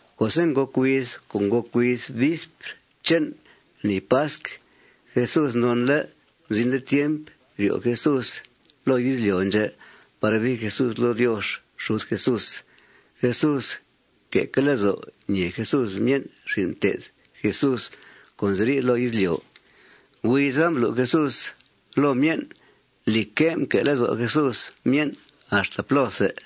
Co'se' ngòc huiz co' ngòc huiz vispr che'n lni pasc, Jesús nonle' mzinle' tiemp ryo' Jesús loo izlyo' ndxè' par bii Jesús loo Diox xud Jesús. Jesús mque'que' lezo' ñèe Jesús myen' xin' mté'th Jesús co' nziri' loo izlyo'. Huiza mblu' Jesús loo myen', lìcque', mque' lezo' Jesús myen' axta plóthe.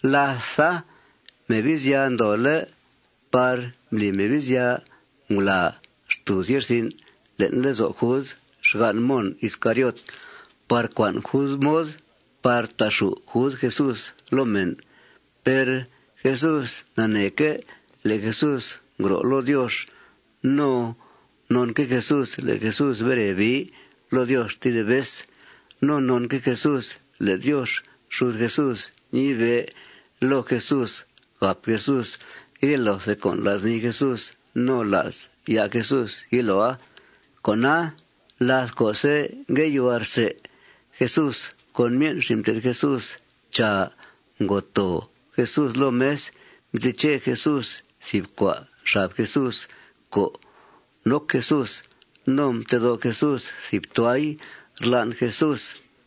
Látha, Mebizya ndoole' par mbli Mebizya ngulàa xtùuz ye'rsin' le'n lezo' Jud, xgan' Mon Iscariot, par cua'n Jud mod par ta'xù' Jud Jesús loo mèn. Per Jesús naneeque' le' Jesús ngro' loo Diox. No nonque' Jesús le' Jesús bere bii loo Diox tedib vez. No nonque' Jesús le' Diox xud Jesús mnibe' loo Jesús gàp Jesús rye loothe con' la's nii Jesús no la's ya' Jesús yiloa. Con'a, láth co'se' ngue yuhua rsè Jesús con myen' xin' mté'th Jesús, chàa, ngo too Jesús loo mes. Mteche Jesús thìb cua' xab Jesús co' noc Jesús. No mtedó' Jesús thìb tuay rlan' Jesús.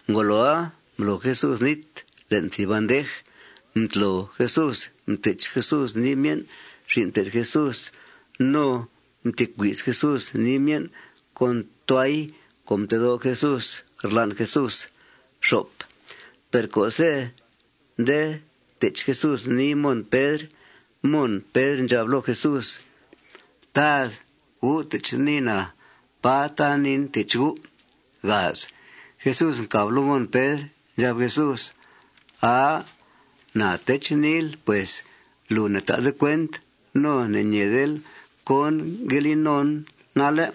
Ngoloa, mblo Jesús nít le'n thìb bandej. Mtlo Jesús, mtech Jesús nii myen' xin' mté'th Jesús. No mtecui's Jesús nii myen' con tuay co' mtedó' Jesús rlan' Jesús. Per co'se' nde tech Jesús nii Mon Pedr, Mon Pedr ndxab loo Jesús: ―Tad, ¿U' tech niin, à? ¡Pà tan niin tech U'! Jesús mcàb loo Mon Pedr. Ndxab Jesús: ―Aa, na tech niil pues. Lùu ne'ta'de cuent no ne'ñeedel cón ngue li nonl nalle'.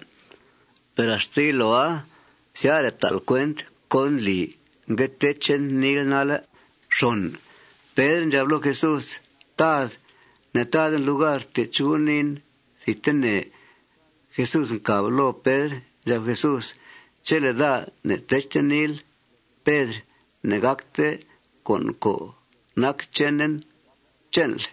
Per axta yiloa syare' ta'l cuent cón ndli ngue techen niil nalle'. Pedr ndxab loo Jesús: ―Tad, ne'taden lugar tech U' niin thidtene. Jesús mcàb loo Pedr. Ndxab Jesús: ―Chele' daa ne'techte niil, Pedr, ne'gàcte con' co' nac chenen che'nl.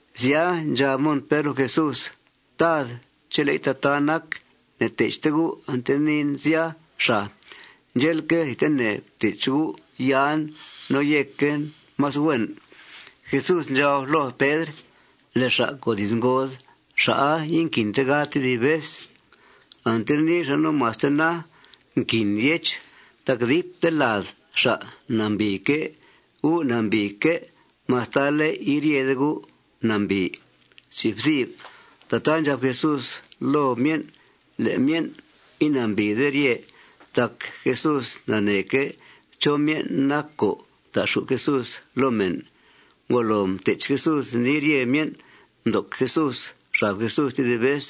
Sya, ndxab Mon Pedr loo Jesús: ―Tad, chele'i tataa nac, ne'techte U' ante niin sya, xàa. Ndxe'leque', thidtene ftech U' yan no yéquen más huen. Jesús ndxab loo Pedr: ―Le' xa' co' diz ngod, xa'a inquinte gad tedib vez. Ante nii xa' no maste na, nquin yech tac dipte lad xa' nambìique'. Gu' nambìique' mastale' iryede gu' nambìi. Tataa ndxab Jesús loo myen' le' myen' inambìide rye tac Jesús naneeque' chó myen' nac co' ta'xù' Jesús loo mèn. Ngolo mtech Jesús nii rye myen', mdoc Jesús xab Jesús tedib vez.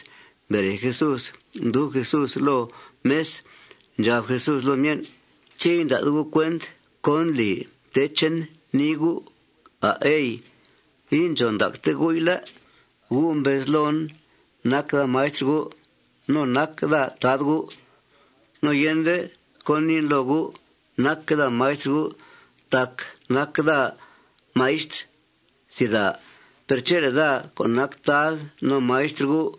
Mbere Jesús, mdub Jesús loo mes. Ndxab Jesús loo myen': ―¿Ché' inda'de gu' cuent cón ndli mtechen nii gu', à', ey? Indxòn ndacte gu'i, ¿lé'? Gu' mbez loon: Nac daa maistr gu' no nac daa Tad gu'. No yende cón niin loo gu' nacque' daa maistr gu' tac nac daa maistr. Per chele' daa co' nac Tad no maistr gu'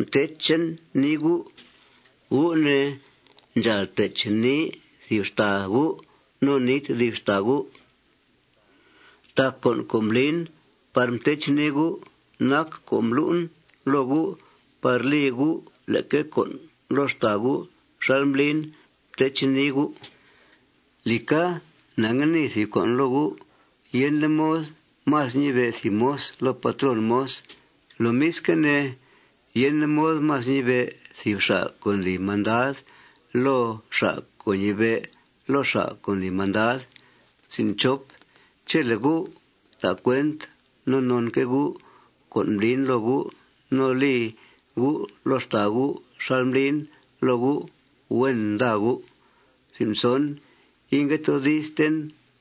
mtechen nii gu', gu' ne, ndxàal tech nii thìb xtàa gu' no nii tedib xtàa gu'. Tac con' co' mblin par mtechen nii gu' nac co' mblu'en loo gu' par li gu' leque con' loo xtàa gu' xal mblin mtechen nii gu'. Lìca, na ngue nii thìb con' loo gu': Yende mod más ñibe' thìb moz loo patrón moz. Lomisque' ne, yende mod más ñibe' thìb xa' co' ndli mandad loo xa' co' ñibe' loo xa' co' ndli mandad. Chele' gu' ta' cuent no nonque' gu' con' mblin loo gu' no li gu' loo xtàa gu' xal mblin loo gu', huen nda gu'. Ingue toodisten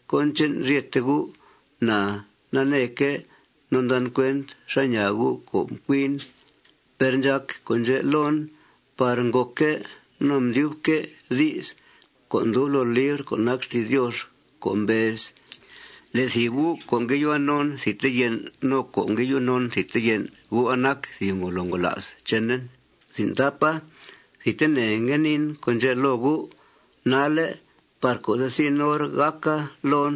cón che'n ryete gu'. Na naneeque' no ndan cuent xá ñaa gu' co' mcuin. Per ndxàc con' ndxè' loon par ngòcque' no mdyubque' di's co' ndub loo libr co' nac xti's Diox co' mbez: Le' thìb gu' co' ngue yuhua non thidte yen', no co' ngue yu non thidte yen', gu'a nac thìb ngolo ngola's chenen. Thidtene ngue niin con' ndxè' loo gu' nalle' par co'se' zin hor gàca loon,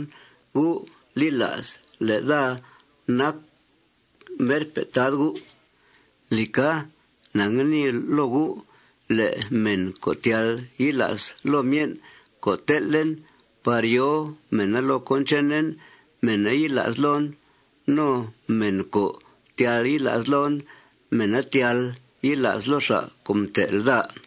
gu' li la's le' daa nac merpe' Tad gu'. Lìca, na ngue nii loo gu': Le' mèn co' tyal yila's loo myen' co' tel'en par yòo mèna loo cón chenen, mèna yila's loon. No mèn co' tyal yila's loon, mèna tyal yila's loo xa' co' mtel' daa.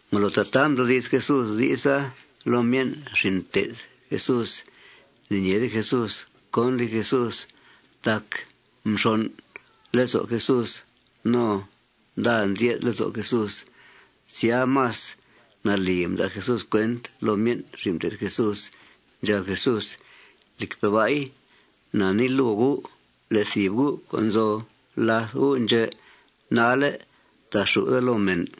Ngolo tataa mdoodi's Jesús di'sa loo myen' xin' mté'th Jesús, ne'ñeede Jesús cón li Jesús. Tac mxon' lezo' Jesús. No nda ndye'th lezo' Jesús. Sya, más nalì mda' Jesús cuent loo myen' xin' mté'th Jesús. Ndxab Jesús: ―Lìcpe' ba'i, na nii loo gu': Le' thìb gu' co' nzo làth gu' ndxè' nalle' ta'xù' daa loo mèn.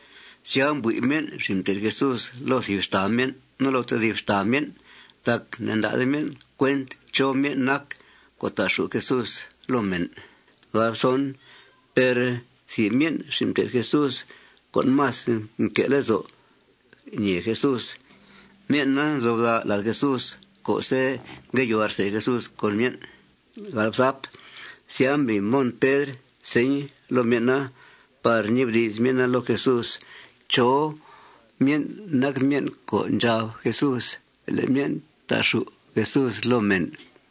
Sya, mbui' myen' xin' mté'th Jesús loo thìb xtàa myen' no loo tedib xtàa myen' tac ne'nda'de myen' cuent chó myen' nac co' ta'xù' Jesús loo mèn. Per thìb myen' xin' mté'th Jesús co' más mque' lezo' ñèe Jesús, myen'a nzo bda' lad Jesús co'se' ngue yuhua rsè Jesús con myen'. Sya, mbli Mon Pedr señ loo myen'a par ñibdi's myen'a loo Jesús chó myen' nac myen' co' ndxab Jesús le' myen' ta'xù' Jesús loo mèn.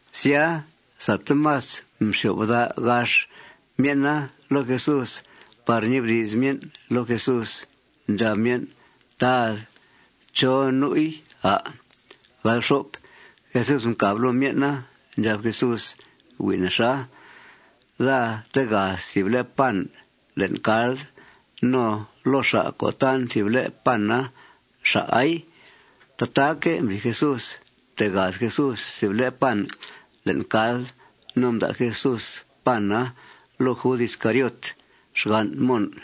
Sya, sate más mxyo'f bda' gax myen'a loo Jesús par ñibdi's myen' loo Jesús. Ndxab myen': ―Tad, ¿chó nu'i, à'? Jesús mcàb loo myen'a. Ndxab Jesús: ―Hui' nexa. Daa tegaz thìb le' pan le'n cald. No loo xa' co' tan thìb le' pana, xa'ai. Tataaque' mbli Jesús. Mtegaz Jesús thìb le' pan le'n cald. No mda' Jesús pana loo Jud Iscariot, xgan' Mon.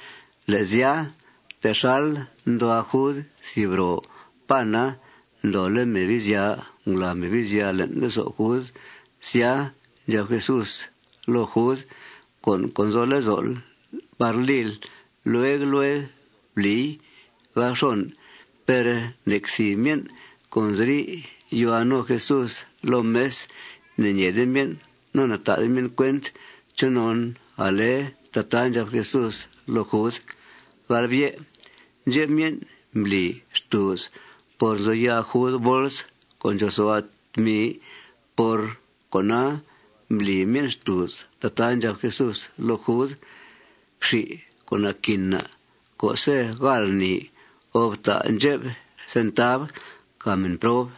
Le' sya, texal nduhua Jud thìb ro pana, ndoole' Mebizya ngulàa Mebizya le'n lezo' Jud. Sya, ndxab Jesús loo Jud: ―Con' co' nzo lezo'l par lil, lueg lueg blii. Per nec thìb myen' co' nzi yuhua no Jesús loo mes, ne'ñeede myen' no ne'ta'de myen' cuent chonon ale tataa ndxab Jesús loo Jud. Ndxep myen' mbli xtùuz por nzo ya' Jud bols co' ndxòosua' tmi, por cona mbli myen' xtùuz tataa ndxab Jesús loo Jud: Fxi con' naquin na' co'se' gáal lni, o: Fta' ndxep centav càa mèn prob.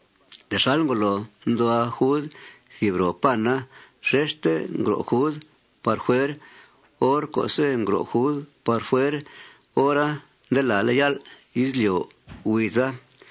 Texal ngolo nduhua Jud thìb ro pana, xexte ngro' Jud par fuer. Hor co'se' ngro' Jud par fuer, hora nde làale' yál' izlyo' huiza.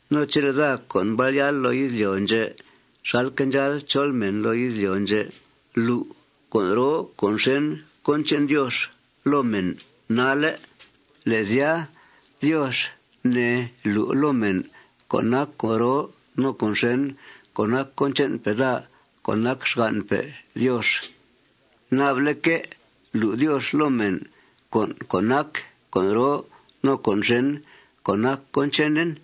No chele' daa, co' mbal yáal loo izlyo' ndxè' xalque' ndxáal chol mèn loo izlyo' ndxè', lu' con' roo no con' xèn cón che'n Diox loo mèn nalle', le' sya, Diox, ne, lu' loo mèn con' co' nac con' roo no con' xèn co' nac cón che'npe' daa co' nac xgan'pe' Diox. Naba'leque' lu' Diox loo mèn con' co' nac con' roo no con' xèn co' nac cón chenen.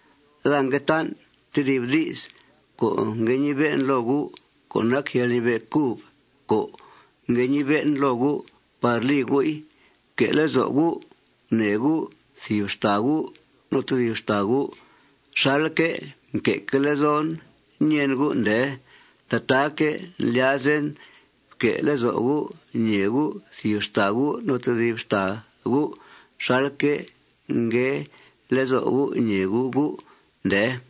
Daa ngue tan' tedib di's co' ngue ñibe'en loo gu' co' nac yalñibe' cub co' ngue ñibe'en loo gu' par li gu'i: Fque' lezo' gu' gunèe gu' thìb xtàa gu' no tedib xtàa gu' xalque' mque'que' lezon ñèen gu', ndee. Tataaque' ndlyazen fque' lezo' gu' ñèe gu' thìb xtàa gu' no tedib xtàa gu' xalque' ngue lezo' gu' ñèe gu' gu', ndee.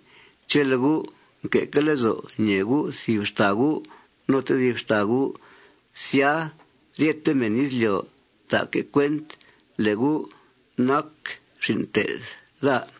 Chele' gu' nque'que' lezo' ñèe gu' thìb xtàa gu' no tedib xtàa gu', sya, ryete mèn izlyo' ta'que' cuent le' gu' nac xin' mté'th daa.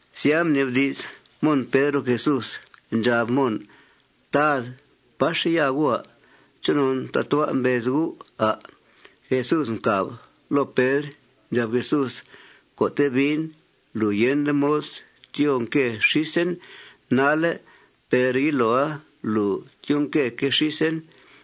Sya, mnibdi's Mon Pedr loo Jesús. Ndxab Mon: ―Tad, ¿páxe' ya U'? ¿Chonon tatua' mbez U', à'? Jesús mcàb loo Pedr. Ndxab Jesús: ―Co'te' biin, lùu yende mod tyoo nque xísen nalle'. Per yiloa lùu tyoo nqueque' xísen.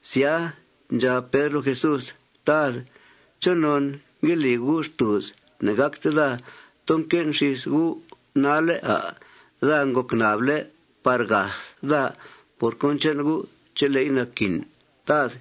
Sya, ndxab Pedr loo Jesús: ―Tad, ¿chonon ngue li U' xtùuz ne'gácte daa too nque'en xís U' nalle', à'? Daa ngòc nable' par gath daa por cón che'n U' chele'i naquin, Tad.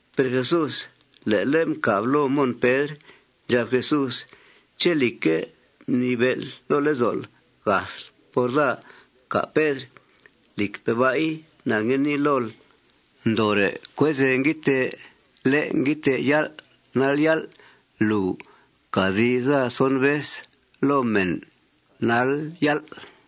Per Jesús le'le' mcàb loo Mon Pedr. Ndxab Jesús: ―¿Ché', lìcque', mnibe'l loo lezo'l gathl por daa, cà', Pedr? Lìcpe' ba'i, na ngue nii lool: Ndoore' cuezèe nguiidtee lé' nguiidtee yál' nal yál', lùu cà di's daa son vez loo mèn nal yál'.